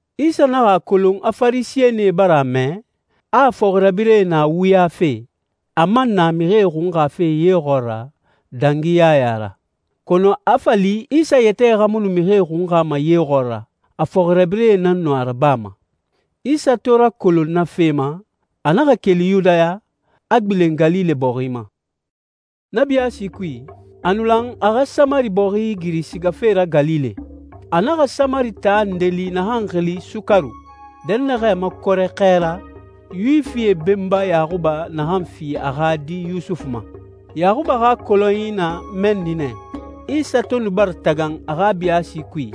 Isa naxa a kolon a Farisɛnie bara a mɛ, a fɔxirabirɛe na wuyafe, a man na mixie xunxafe ye xɔɔra dangi Yaya ra. Kɔnɔ a fa li Isa yɛtɛ xa mu nu mixie xunxama ye xɔɔra, a fɔxirabirɛe nan nu a rabama. Isa to rakolon na fe ma, a naxa keli Yudaya, a gbilen Galile bɔxi ma. Na biyaasi kui, a nu lan a xa Samari bɔxi igiri sigafe ra Galile. A naxa Samari taa nde li naxan xili Sukaru, dɛnnaxɛ makɔrɛ xɛ ra, Yuwifie benba Yaxuba naxan fi a xa di Yusufu ma. Yaxuba xa kɔlɔnyi na mɛnni nɛ. Isa to nu bara tagan a xa biyaasi kui,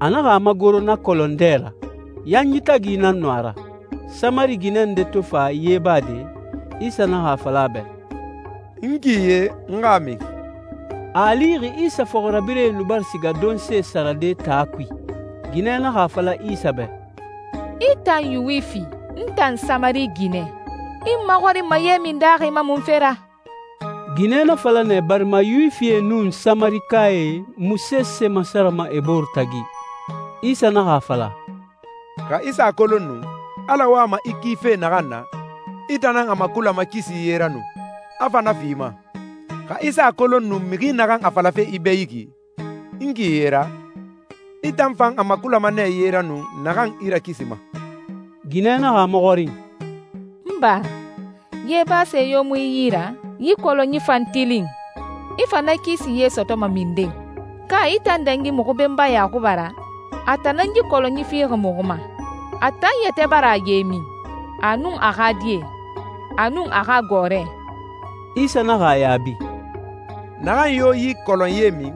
a naxa a magoro na kɔlɔn dɛ ra. Yanyi tagi nan nu a ra. Samari ginɛ nde to fa ye bade, Isa naxa a fala a bɛ, «N ki ye, n xa a min.» A a lixi Isa fɔxirabirɛe nu bara siga donse sarade taa kui. Ginɛ naxa a fala Isa bɛ, «I tan Yuwifi, n tan Samari ginɛ. I n maxɔrinma ye min daaxi ma munfe ra?» Ginɛ na fala nɛ barima Yuwifie nun Samarikae mu sese masarama e bore tagi. Isa naxa a fala, «Xa i sa a kolon nu, Ala wama i kife naxan na, i tan nan a makulama kisi ye ra nu, a fa na fi i ma. Xa i sa a kolon nu mixi naxan a falafe i bɛ yi ki, ‹n ki ye ra,› i tan fan a makulama nɛ ye ra nu naxan i rakisima.» Ginɛ naxa a maxɔrin, «N ba, ye base yo mu i yi ra, yi kɔlɔnyi fan tilin. I fa na kisi ye sɔtɔma minden? Ka i tan dangi muxu benba Yaxuba ra? A tan nan yi kɔlɔnyi fi muxu ma. A tan yɛtɛ bara a ye min, a nun a xa die, a nun a xa gɔɔrɛ.» Isa naxa a yaabi, «Naxan yo yi kɔlɔn ye min,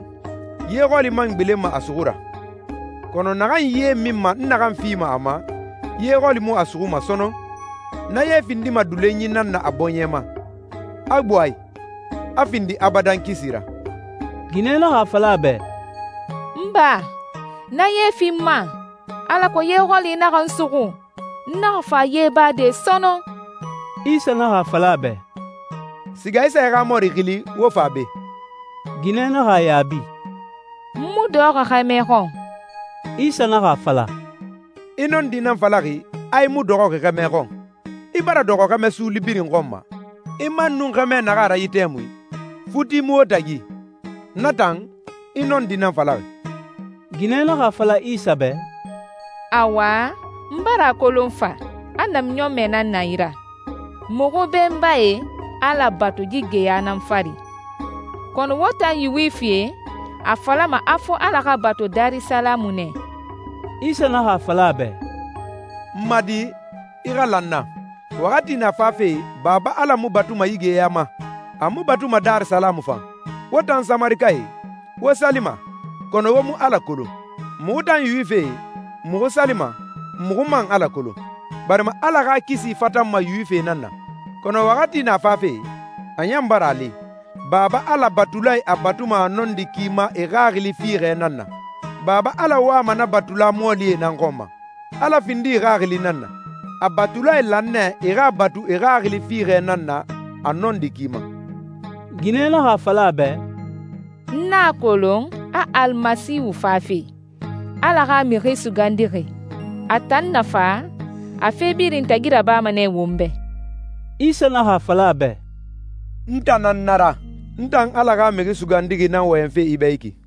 ye xɔli man gbilenma a suxu ra. Kɔnɔ naxan ye minma n naxan fima a ma, ye xɔli mu a suxuma sɔnɔn. Na ye findima dulonyi nan na a bɔɲɛ ma, a gbo a i, a findi abadan kisi ra.» Ginɛ naxa a fala a bɛ, «N ba, na ye fi n ma, alako ye xɔli naxa n suxu, n naxa fa ye bade sɔnɔn.» Isa naxa a fala a bɛ, «Siga i sa i xa mɔri xili, wo fa be.» Ginɛ naxa a yaabi, «N mu dɔxɔxi xɛmɛ xɔn.» Isa naxa a fala, «I nɔndi nan falaxi, a i mu dɔxɔxi xɛmɛ xɔn. I bara dɔxɔ xɛmɛ suuli birin xɔn ma, i man nun xɛmɛ naxan a ra yi tɛmui, futi mu wo tagi. Na tan, i nɔndi nan falaxi.» Ginɛ naxa a fala Isa bɛ, «Awa, n bara a kolon fa, a namiɲɔnmɛ nan na i ra. Muxu benbae Ala batu yi geya nan fari, kɔnɔ wo tan Yuwifie a falama a fo Ala xa batu Darisalamu nɛ.» Isa naxa a fala a bɛ, «N ma di, i xa la n na, waxati na fafe Baba Ala mu batuma yi geya ma, a mu batuma Darisalamu fan. Wo tan Samarikae, wo salima, kɔnɔ wo mu Ala kolon. Muxu tan Yuwifie, muxu salima, muxu man Ala kolon, barima Ala xa kisi fatanma Yuwifie nan na. Kɔnɔ waxati na fafe, a ɲan bara a li, Baba Ala batulae a batuma a nɔndi ki ma e xaxili fiixɛ nan na. Baba Ala wama na batula mɔɔlie nan xɔn ma. Ala findixi Xaxili nan na. A batulae lan nɛ e xa a batu e xaxili fiixɛ nan na a nɔndi ki ma.» Ginɛ naxa a fala a bɛ, «N a kolon a Al Masiihu fafe, Ala xa Mixi Sugandixi. A tan na fa, a fe birin tagi rabama nɛ won bɛ.» Isa naxa a fala a bɛ, «N tan nan na ra, n tan Ala xa Mixi Sugandixi nan wɔyɛnfe i bɛ yi ki.»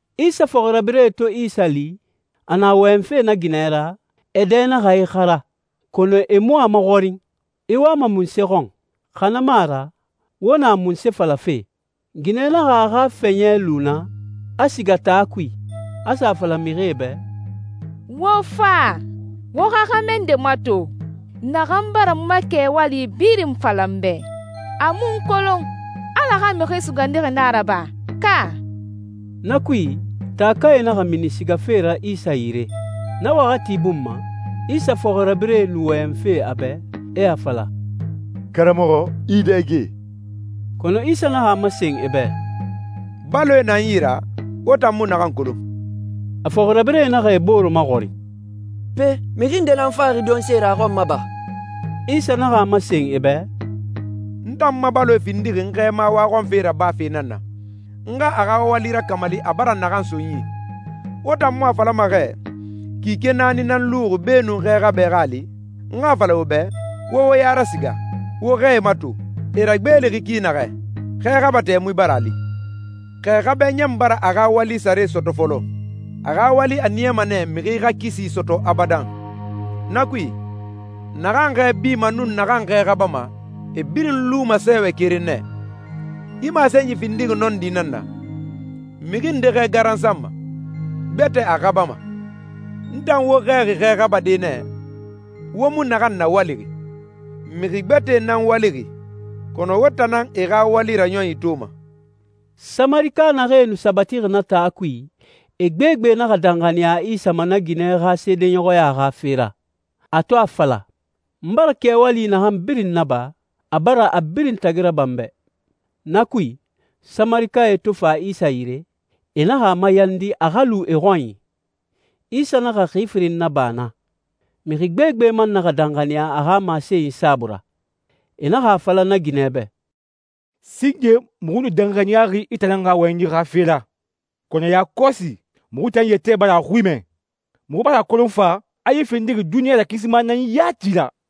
Isa fɔxirabirɛe to Isa li, a na wɔyɛnfe na ginɛ ra, e dɛ naxa ixara, kɔnɔ e mu a maxɔrin, «I wama munse xɔn» xa na mu a ra «Wo na munse falafe?» Ginɛ naxa a xa fɛɲɛ lu naa, a siga taa kui, a sa a fala mixie bɛ, «Wo fa. Wo xa xɛmɛ nde mato naxan bara n ma kɛwali birin fala n bɛ, a mu n kolon. Ala xa Mixi Sugandixi na a ra ba, ka?» Na kui, taakae naxa mini sigafe ra Isa yire. Na waxati bun ma, Isa fɔxirabirɛe nu wɔyɛnfe a bɛ, e a fala, «Karamɔxɔ, i dɛge.» Kɔnɔ Isa naxa a masen e bɛ, «Baloe na n tan yi ra, wo tan mu naxan kolon.» A fɔxirabirɛe naxa e bore maxɔrin, «Pe, mixi nde nan faxi donse ra a xɔn ma ba?» Isa naxa a masen e bɛ, «N tan ma baloe findixi n Xɛɛma waxɔnfe rabafe nan na, n xa a xa wali rakamali a bara naxan so n yi. Wo tan mu a falama xɛ, ‹Kike naani nan luxi beenun xɛ xabɛ xa a li›? N xa a fala wo bɛ, wo wo ya rasiga, wo xɛe mato, e ragbeelixi ki naxɛ. Xɛ xaba tɛmui bara a li. Xɛ xabɛ ɲan bara a xa wali sare sɔtɔ fɔlɔ. A xa wali a niyama nɛ mixi xa kisi sɔtɔ abadan. Na kui, naxan xɛ bima nun naxan xɛ xabama, e birin luma sɛɛwɛ keren nɛ. Yi masenyi findixi nɔndi nan na, ‹Mixi nde xɛ garansanma, gbɛtɛ a xabama.› N tan wo xɛɛxi xɛ xabade nɛ, wo mu naxan nawalixi. Mixi gbɛtɛe nan walixi, kɔnɔ wo tan nan e xa wali raɲɔnyi toma.» Samarika naxee nu sabatixi na taa kui, e gbegbe naxa danxaniya Isa ma na ginɛ xa seedeɲɔxɔya xa fe ra, a to a fala, «N bara kɛwali naxan birin naba, a bara a birin tagi raba n bɛ.» Na kui, Samarikae to fa Isa yire, e naxa a mayandi a xa lu e xɔnyi. Isa naxa xi firin naba naa. Mixi gbegbe man naxa danxaniya a xa masenyi saabui ra. E naxa a fala na ginɛ bɛ, «Singe muxu nu danxaniyaxi i tan nan xa wɔyɛnyi xa fe ra, kɔnɔ yakɔsi muxu tan yɛtɛ bara a xui mɛ. Muxu bara a kolon fa, a yi findixi duniɲa rakisima nan yati ra.»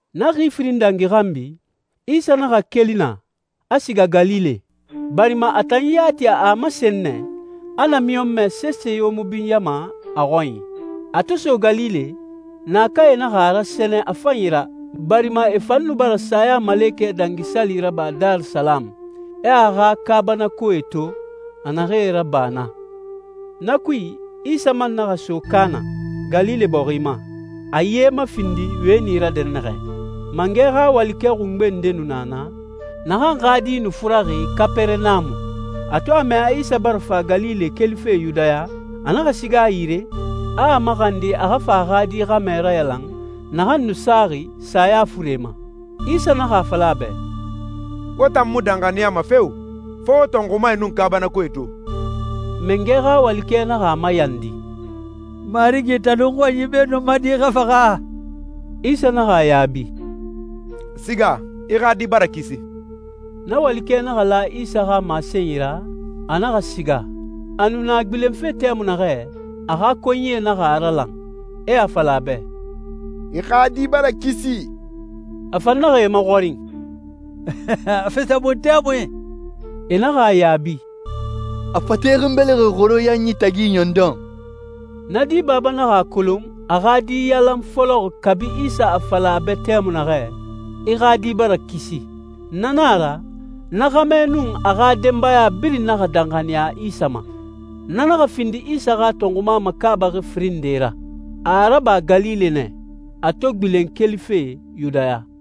Na xi firin dangi xanbi, Isa naxa keli naa, a siga Galile, barima a tan yati a a masen nɛ a namiɲɔnmɛ sese yo mu binyama a xɔnyi. A to so Galile, naakae naxa a rasɛnɛ a fanyi ra, barima e fan nu bara Sayamalekɛ Dangi Sali raba Darisalamu, e a xa kaabanakoe to, a naxee raba naa. Na kui, Isa man naxa so Kaana, Galile bɔxi ma, a ye mafindi wɛni ra dɛnnaxɛ. Mangɛ xa walikɛ xungbe nde nu na naa, naxan xa di nu furaxi Kapɛrɛnamu. A to a mɛ a Isa bara fa Galile kelife Yudaya, a naxa siga a yire, a a maxandi a xa fa a xa di xɛmɛ rayalan naxan nu saxi saya fure ma. Isa naxa a fala a bɛ, «Wo tan mu danxaniyama feo, fo wo tɔnxumae nun kaabanakoe to!» Mangɛ xa walikɛ naxa a mayandi, «Marigi, talu n xɔnyi beenun n ma di xa faxa!» Isa naxa a yaabi, «Siga, i xa di bara kisi.» Na walikɛ naxa la Isa xa masenyi ra, a naxa siga. A nu na gbilenfe tɛmui naxɛ, a xa konyie naxa a ralan, e a fala a bɛ, «I xa di bara kisi!» A fan naxa e maxɔrin, «A fisa mun tɛmui?» E naxa a yaabi, «A fate xinbelixi xoro yanyi tagi ɲɔndɔn.» Na di baba naxa a kolon a xa di yalan fɔlɔ kabi Isa a fala a bɛ tɛmui naxɛ, «I xa di bara kisi.» Na nan a ra, na xɛmɛ nun a xa denbaya birin naxa danxaniya Isa ma. Na naxa findi Isa xa tɔnxuma makaabaxi firin nde ra. A a raba Galile nɛ, a to gbilen kelife Yudaya.